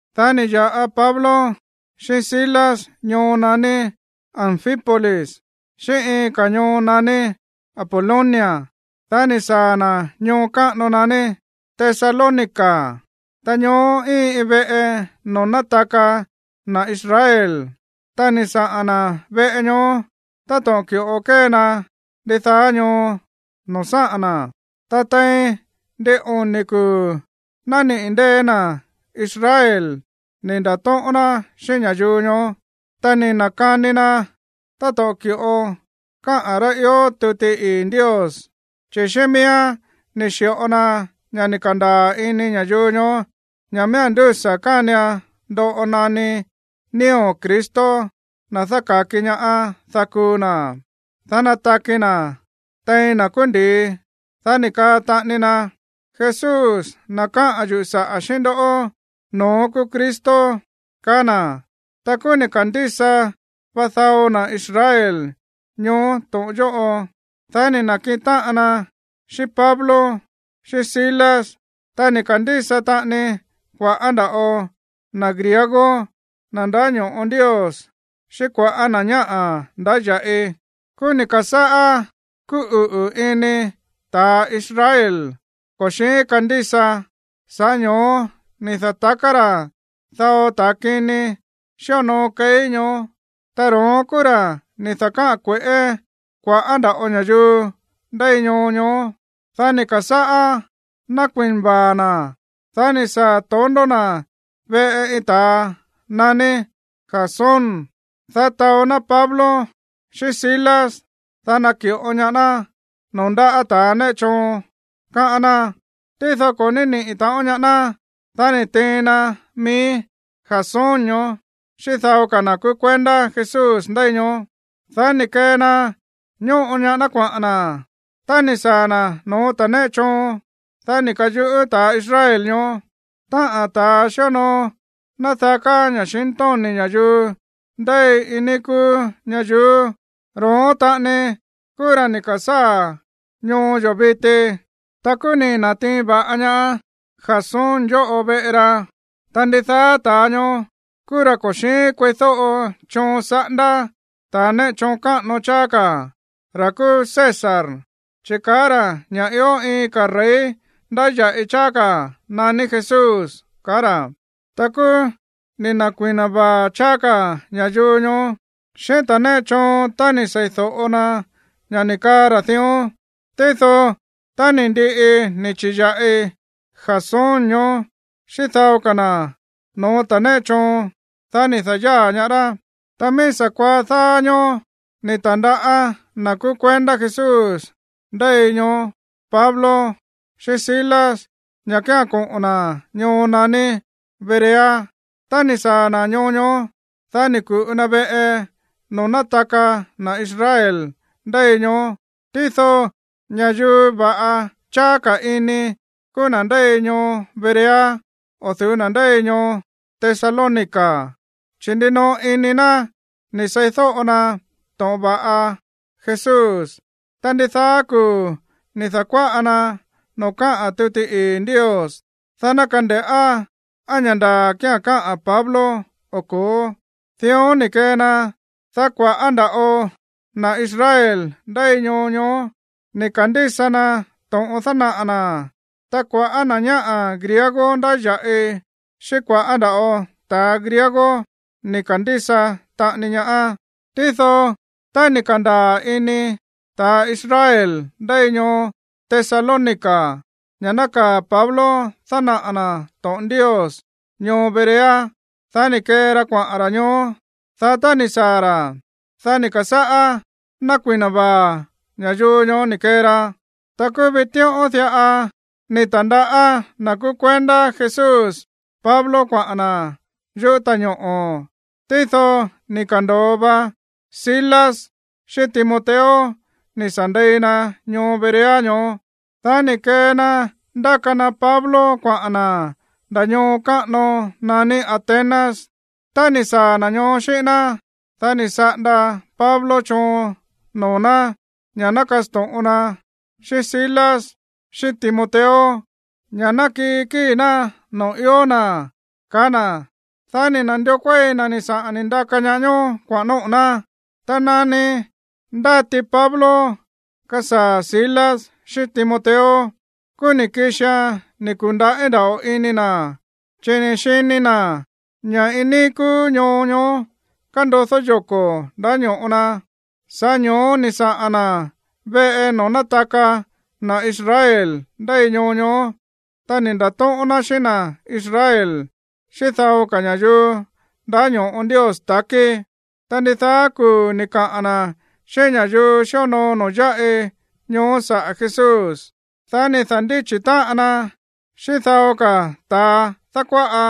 Dá ni̱ ya̱ꞌa Pablo xíꞌín Silas ñoo naní Anfípolis xíꞌín iin ka̱ ñoo naní Apolonia. Dá ni̱ saa̱ na̱ ñoo káꞌano naní Tesalónica. Ta ñoó íin iin veꞌe noo̱ nátaka na̱ Israel. Ta ni̱ saꞌa̱n na̱ veꞌe ñoó táto̱ꞌon ki̱ꞌo kée ná ndidaá ñoo noo̱ sáꞌa̱n na̱. Ta tein ndin oni̱ kuu̱ nániꞌi̱ ndée̱ na̱ Israel ni̱ nda̱tóꞌón ná xíꞌín ña̱yuu ñoó, ta ni̱ na̱kani na táto̱ꞌon ki̱ꞌo káꞌa̱n rá ió tuti ii̱ Ndios. Chi̱ xíꞌín miíán ni̱ xi̱ꞌo na ña̱ ni̱ ka̱ndaa̱ ini ña̱yuu ñoó ña̱ miía̱n ndúsa̱ kánian ndoꞌo naní nío̱ Cristo, na̱ dáka̱ki ñaá, dá kuu na̱, dá nataki na̱ tein na̱ kúú ndi̱i. Dá ni̱ kaa taꞌani na: ―Jesús, na̱ káꞌa̱n yuꞌu̱ saꞌa̱ xíꞌín ndoꞌó, no̱ón kúú Cristo ―kaá na̱. Ta kúú ni̱ ka̱ndísa va dao na̱ Israel ñoó to̱ꞌon yóꞌo. Dá ni̱ na̱kiꞌin táꞌan na xíꞌín Pablo xíꞌín Silas. Ta ni̱ ka̱ndísa taꞌani kua̱ꞌá nda̱ꞌo na̱ griego, na̱ ndáño̱ꞌo Ndios, xíꞌín kua̱ꞌá na̱ ñáꞌa̱ ndáya̱ꞌi. Kúú ni̱ ka̱sáꞌá kúꞌuꞌu̱ ini ta̱a Israel ko̱ xi̱ín kandísa. Sa̱ꞌá ño̱ó ni̱ da̱taká ra̱ dao ta̱ kini xíonoo keí ñoó. Ta ro̱ón kúú ra̱ ni̱ da̱káꞌa̱n kue̱ꞌé kua̱ꞌá nda̱ꞌo ña̱yuu ndéi ñoo ñoó. Dá ni̱ ka̱sáꞌá nákui̱na vaa̱ na̱. Dá ni̱ saa̱ tondó na̱ veꞌe iin ta̱a naní Jasón, dá taó ná Pablo xíꞌín Silas, dá ná naki̱ꞌo ñaá ná noo̱ ndáꞌa̱ ta̱ néꞌe choon, káꞌán ná. Tído ko̱ ní nániꞌi̱ taꞌon ñaá ná. Dá ni̱ tiin na mií Jasón ñoó xíꞌín dao ka̱ na̱ kúú kuendá Jesús ndéi ñoó, dá ni̱ kee na ñóꞌo ñaá ná kuaꞌa̱n na̱. Tá ni̱ saa̱ na̱ no̱ó ta̱ néꞌe choon, dá ni̱ ka̱yuꞌú ta̱ Israel ñoó: ―Táꞌa̱n ta̱a xíonoo nádaká ña̱xintóni̱ ña̱yuu ndéi iin níí kúú ñayuú, ro̱ón taꞌani kúú ra̱ ni̱ ka̱sáa̱ ñoo yo̱ viti. Ta kúú ni̱ na̱tiin va̱ꞌa ñaá Jasón yóꞌo veꞌe ra. Ta ndidaá ta̱a ñoó kúú ra̱ ko̱ xi̱ín kueídóꞌo choon saꞌándá ta̱ néꞌe choon káꞌano cháá ka̱, ra̱ kúú César, chi̱ kaá ra̱ ña̱ ió iin ka̱ rey ndáya̱ꞌi cháá ka̱ naní Jesús ―kaá ra̱. Ta kúú ni̱ na̱kui̱na vaa̱ cháá ka̱ ña̱yuu ñoó xíꞌín ta̱ néꞌe choon tá ni̱ seídóꞌo na ña̱ ni̱ kaa ra̱ dión. Tído tá ni̱ ndiꞌi ni̱ chi̱ya̱ꞌi Jasón ñoó xíꞌín dao ka̱ na̱ no̱ó ta̱ néꞌe choon, dá ni̱ da̱yáa̱ ñaá rá. Ta mií sa̱kuaá dáá ñóó ni̱ ta̱ndaꞌá na̱ kúú kuendá Jesús ndéi ñoó Pablo xíꞌín Silas ña̱ kía̱n koꞌo̱n na̱ ñoo naní Berea. Tá ni̱ saa̱ na̱ ñoo ñoó, dá ni̱ ku̱ꞌu na veꞌe noo̱ nátaka na̱ Israel ndéi ñoó. Tído ña̱yuu va̱ꞌa cháá ka̱ ini kúú na̱ ndéi ñoo Berea o̱ du̱ú na̱ ndéi ñoo Tesalónica, chi̱ ndinoꞌo ini na̱ ni̱ sei̱do̱ꞌo na to̱ꞌon va̱ꞌa Jesús. Ta ndidaá kuu̱ ni̱ da̱kuáꞌa na noo̱ káꞌa̱n tuti ii̱ Ndios, dá ná kande̱ꞌá á ña̱ ndaa̱ kía̱n káꞌa̱n Pablo o ko̱ó. Dión ni̱ kee na, dá kua̱ꞌá nda̱ꞌo na̱ Israel ndéi ñoo ñoó ni̱ ka̱ndísa na to̱ꞌon dánaꞌa̱ na̱. Ta kua̱ꞌá na̱ ñáꞌa̱ griego ndáya̱ꞌi xíꞌín kua̱ꞌá nda̱ꞌo ta̱a griego ni̱ ka̱ndísa taꞌani ñaá. Tído tá ni̱ ka̱ndaa̱ ini ta̱ Israel ndéi ñoo Tesalónica ña̱ nákaa̱ Pablo dánaꞌa̱ na̱ to̱ꞌon Ndios ñoo Berea, dá ni̱ kee ra kuaꞌa̱n ra̱ ñoó. Dá tá ni̱ saa̱ ra̱, dá ni̱ ka̱sáꞌá nákui̱na vaa̱ ña̱yuu ñoó ni̱ kee ra. Ta kúú vitíꞌón diꞌa ni̱ ta̱ndaꞌá na̱ kúú kuendá Jesús Pablo kuaꞌa̱n na̱ yuꞌú ta̱ñoꞌo̱. Tído ni̱ ka̱ndo̱o va Silas xíꞌín Timoteo ni̱ sa̱ ndei na ñoo Berea ñoó. Dá ni̱ kee na ndáka na Pablo kuaꞌa̱n na̱ nda̱ ñoo káꞌano naní Atenas. Tá ni̱ saa̱ na̱ ñoó xíꞌín ná, dá ni̱ saꞌanda Pablo choon noo̱ ná ña̱ ná kasto̱ꞌon na xíꞌín Silas xíꞌín Timoteo ña̱ ná kii kíi̱ ná noo̱ ió na̱, kaá na̱. Dá ni̱ na̱ndió kuéi na̱ ni̱ saꞌa̱n ni̱ ndaka na ñoó kuaꞌa̱n nóꞌo̱ ná. Ta nani ndáti Pablo kasaa̱ Silas xíꞌín Timoteo, kúú ni̱ kixian ni̱ ku̱ndaꞌí nda̱ꞌo ini na̱, chi̱ ni̱ xini na̱ ña̱ iin níí kúú ñoo ñoó kándodó yoko̱ ndáño̱ꞌo na. Sa̱ꞌá ño̱ó ni̱ saꞌa̱n na̱ veꞌe noo̱ nátaka na̱ Israel ndéi ñoo ñoó, ta ni̱ nda̱tóꞌón ná xíꞌín na̱ Israel, xíꞌín dao ka̱ ña̱yuu ndáño̱ꞌo Ndios ta̱kí. Ta ndidaá kuu̱ ni̱ kaꞌa̱n na̱ xíꞌín ña̱yuu xíonoo noo̱ yáꞌi ñoó saꞌa̱ Jesús. Dá ni̱ da̱ndíchi̱ táꞌan na xíꞌín dao ka̱ ta̱a dákuáꞌa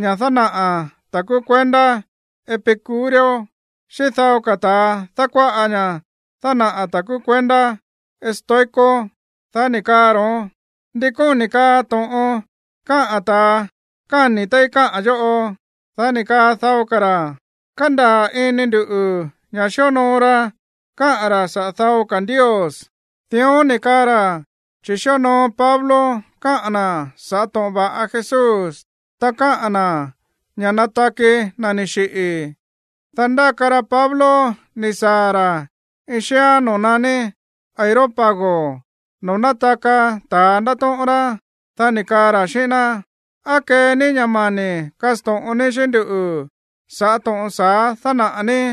ña̱ dánaꞌa̱ ta̱ kúú kuendá epicúreo, xíꞌín dao ka̱ ta̱a dákuáꞌa ña̱ dánaꞌa̱ ta̱ kúú kuendá estoico. Dá ni̱ kaa ro̱ón: ―¿Ndi kóni̱ kaa to̱ꞌon káꞌa̱n ta̱a káni̱ téí káꞌa̱n yóꞌo? Dá ni̱ kaa dao ka̱ ra̱: ―Kándaa̱ ini nduꞌu̱ ña̱ xíonoo ra káꞌa̱n ra̱ saꞌa̱ dao ka̱ ndios. Dión ni̱ kaa ra̱ chi̱ xíonoo Pablo káꞌa̱n na̱ sa̱ꞌá to̱ꞌon va̱ꞌa Jesús, ta káꞌa̱n na̱ ña̱ nataki na̱ ni̱ xiꞌi̱. Dá ndáka ra Pablo ni̱ saa̱ ra̱ iin xíán noo̱ naní Areópago, noo̱ nátaka ta̱a ndátóꞌón rá. Dá ni̱ kaa ra̱ xíꞌín ná: ―¿Á kee ní ña̱ mani̱ kasto̱ꞌon ní xíꞌín nduꞌu̱ sa̱ꞌá to̱ꞌon sa̱á dánaꞌa̱ ní?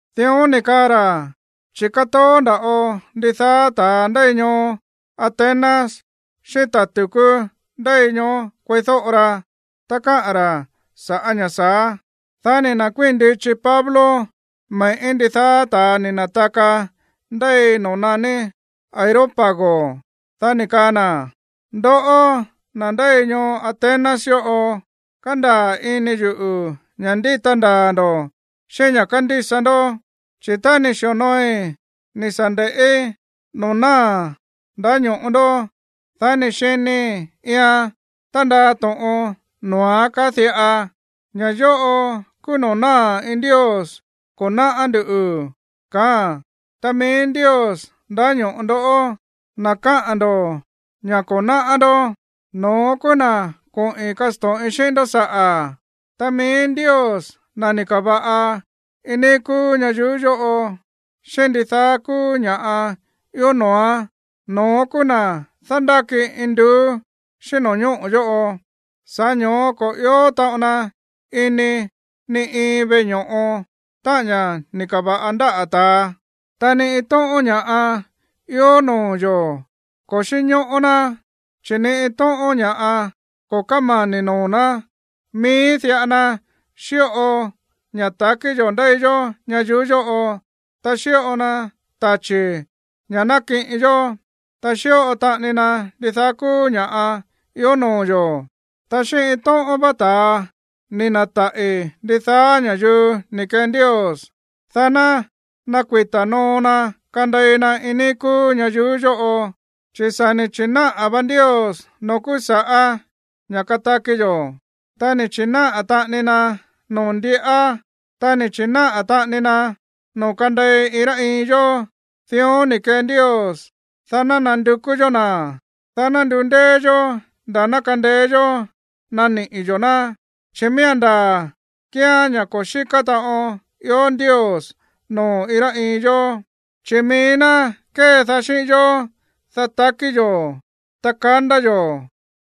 Dión ni̱ kaa ra̱, chi̱ kátoó nda̱ꞌo ndidaá ta̱a ndéi ñoo Atenas xíꞌín ta̱ tu̱kú ndéi ñoó kueídóꞌo ra, ta káꞌa̱n ra̱ sa̱ꞌá ña̱ sa̱á. Dá ni̱ na̱kuíi̱n ndichi Pablo me̱ꞌí ndidaá ta̱a ni̱ na̱taka ndéi noo̱ naní Areópago. Dá ni̱ kaa na̱: ―Ndoꞌó, na̱ ndéi ñoo Atenas yóꞌo, kándaa̱ ini yuꞌu̱ ña̱ ndíta ndaa̱ ndo̱ xíꞌín ña̱ kándísa ndó. Chi̱ tá ni̱ xi̱onooi ni̱ sa̱ nde̱ꞌí noo̱ náa̱ ndáño̱ꞌo ndó, dá ni̱ xinii̱ iian tándaa to̱ꞌon noo̱án kaá diꞌa: “Ña̱ yóꞌo kúú noo̱ náa̱ iin ndios ko̱ náꞌá ndú”, kaáa̱n. Ta mií Ndios ndáño̱ꞌo ndó, na̱ kaá ndo̱ ña̱ ko̱ náꞌá ndó, no̱ón kúú na̱ koꞌi̱n kasto̱ꞌin xíꞌín ndó saꞌa̱. ’Ta mií Ndios, na̱ ni̱ ka̱va̱ꞌa iin níí kúú ñayuú yóꞌo, xíꞌín ndidaá kúú ña̱ꞌa ió noo̱án, no̱ón kúú na̱ dándáki induú xíꞌín no̱ñóꞌo̱ yóꞌo. Sa̱ꞌá ño̱ó ko̱ ió taꞌon na ini ni iin veꞌe ño̱ꞌo, táꞌa̱n ña̱ ni̱ ka̱va̱ꞌa ndáꞌa̱ ta̱a. Ta ni iin tóꞌón ña̱ꞌa ió noo̱ yo̱ ko̱ xínñóꞌó ná, chi̱ ni iin tóꞌón ña̱ꞌa ko̱ kómani̱ noo̱ ná. Mií diꞌa na xíꞌo ña̱ ta̱kí yo̱ ndéi yó ñayuú yóꞌo, ta xíꞌo na tachi̱ ña̱ nákiꞌin yó, ta xíꞌo taꞌani na ndidaá kúú ña̱ꞌa ió noo̱ yo̱. ’Ta xíꞌín iin tóꞌón vá ta̱a ni̱ na̱taꞌi̱ ndidaá ña̱yuu ni̱ kee Ndios, dá ná nakuita̱ noo na kandei na iin níí kúú ñayuú yóꞌo. Chi̱ sa̱ ni̱ chi̱náꞌa̱ vá Ndios noo̱ kúú sa̱ꞌá ña̱ kataki yo̱, ta ni̱ chi̱náꞌa̱ taꞌani na noo̱ ndiꞌá, ta ni̱ chi̱náꞌa̱ taꞌani na noo̱ kandei iin rá iin yó. Dión ni̱ kee Ndios, dá ná nandukú yó na̱, dá ná ndundéé yó nda̱ ná kandeé yó naniꞌi̱ yo̱ ná. Chi̱ miía̱n ndaa̱ kíán ña̱ ko̱ xíká taꞌon ió Ndios noo̱ iin rá iin yó. Chi̱ mií ná kédaá xíꞌín yó, dá takí yo̱, ta kandá yo̱,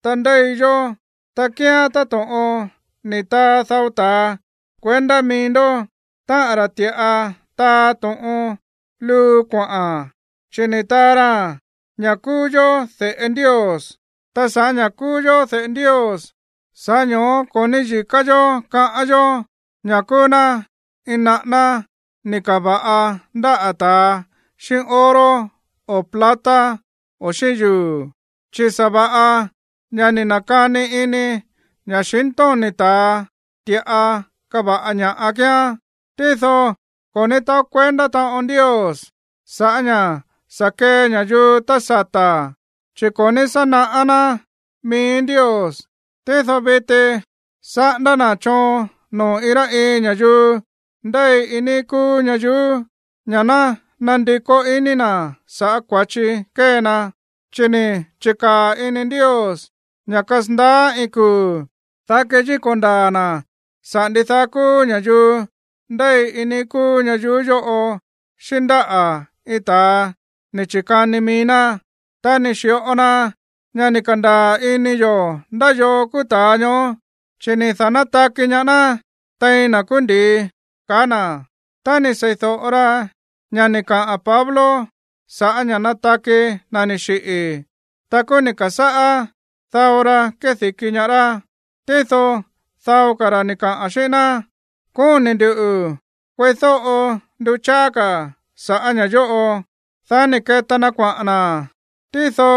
ta ndéi yó. Ta kíán táto̱ꞌon ni̱ taa dao ta̱a kuendá mií ndó, táꞌa̱n ra̱ ti̱ꞌa taa to̱ꞌon luu kuaꞌa̱n, chi̱ ni̱ taa ra ña̱ kúú yó de̱ꞌe Ndios. Ta sa̱ꞌá ña̱ kúú yó de̱ꞌe Ndios, sa̱ꞌá ño̱ó ko̱ níyi̱ká yó kaꞌán yó ña̱ kúú ná iin naꞌáná ni̱ ka̱va̱ꞌa ndáꞌa̱ ta̱a xíꞌín oro o plata o xíꞌín yuu̱, chi̱ sa̱va̱ꞌa ña̱ ni̱ na̱kani ini ña̱xintóni̱ ta̱a ti̱ꞌa káva̱ꞌa ña kíán. ’Tído ko̱ ní taó kuendá taꞌon Ndios sa̱ꞌá ña̱ sa̱ kee ña̱yuu tá sata̱, chi̱ ko̱ ní sá naꞌá ná mií Ndios. Tído viti saꞌándá na̱ choon noo̱ iin rá iin ña̱yuu ndéi iin níí kúú ñayuú ña̱ ná nandikó iní na̱ sa̱ꞌá kua̱chi kée na. Chi̱ ni̱ chi̱kaa̱ ini Ndios ña̱ kasandaá iin kuu̱, dá keyíko̱ ndaa̱ na̱ saꞌa̱ ndidaá kúú ña̱yuu ndéi iin níí kúú ñayuú yóꞌo xíꞌín ndáꞌa̱ iin ta̱a ni̱ chi̱kani mií ná. Ta ni̱ xi̱ꞌo na ña̱ ni̱ ka̱ndaa̱ ini yo̱ ndá yoo kúú ta̱a ñoó, chi̱ ni̱ da̱nátaki ñaá ná tein na̱ kúú ndi̱i ―kaá na̱. Tá ni̱ sei̱do̱ꞌo ra ña̱ ni̱ kaꞌa̱n Pablo sa̱ꞌá ña̱ nataki na̱ ni̱ xiꞌi̱, ta kúú ni̱ ka̱sáꞌá dao ra kédi̱ki ñaá rá. Tído dao ka̱ ra̱ ni̱ kaa xíꞌín ná: ―Kóni̱ nduꞌu̱ kueídóꞌo ndu cháá ka̱ sa̱ꞌá ña̱ yóꞌo. Dá ni̱ keta na kuaꞌa̱n na̱. Tído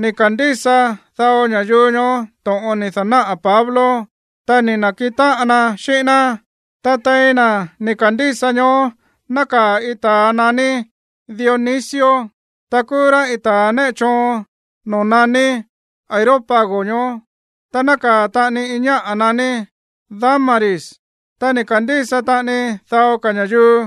ni̱ ka̱ndísa dao ña̱yuu ñoó to̱ꞌon ni̱ da̱náꞌa̱ Pablo, ta ni̱ na̱kiꞌin táꞌan na xíꞌín ná. Ta tein na̱ ni̱ ka̱ndísa ñoó nákaa̱ iin ta̱a naní Dionisio, ta kúú rá iin ta̱a néꞌe choon noo̱ naní Areópago ñoó. Ta nákaa̱ taꞌani iin ñáꞌa̱ naní Dámaris, ta ni̱ ka̱ndísa taꞌani dao ka̱ ña̱yuu.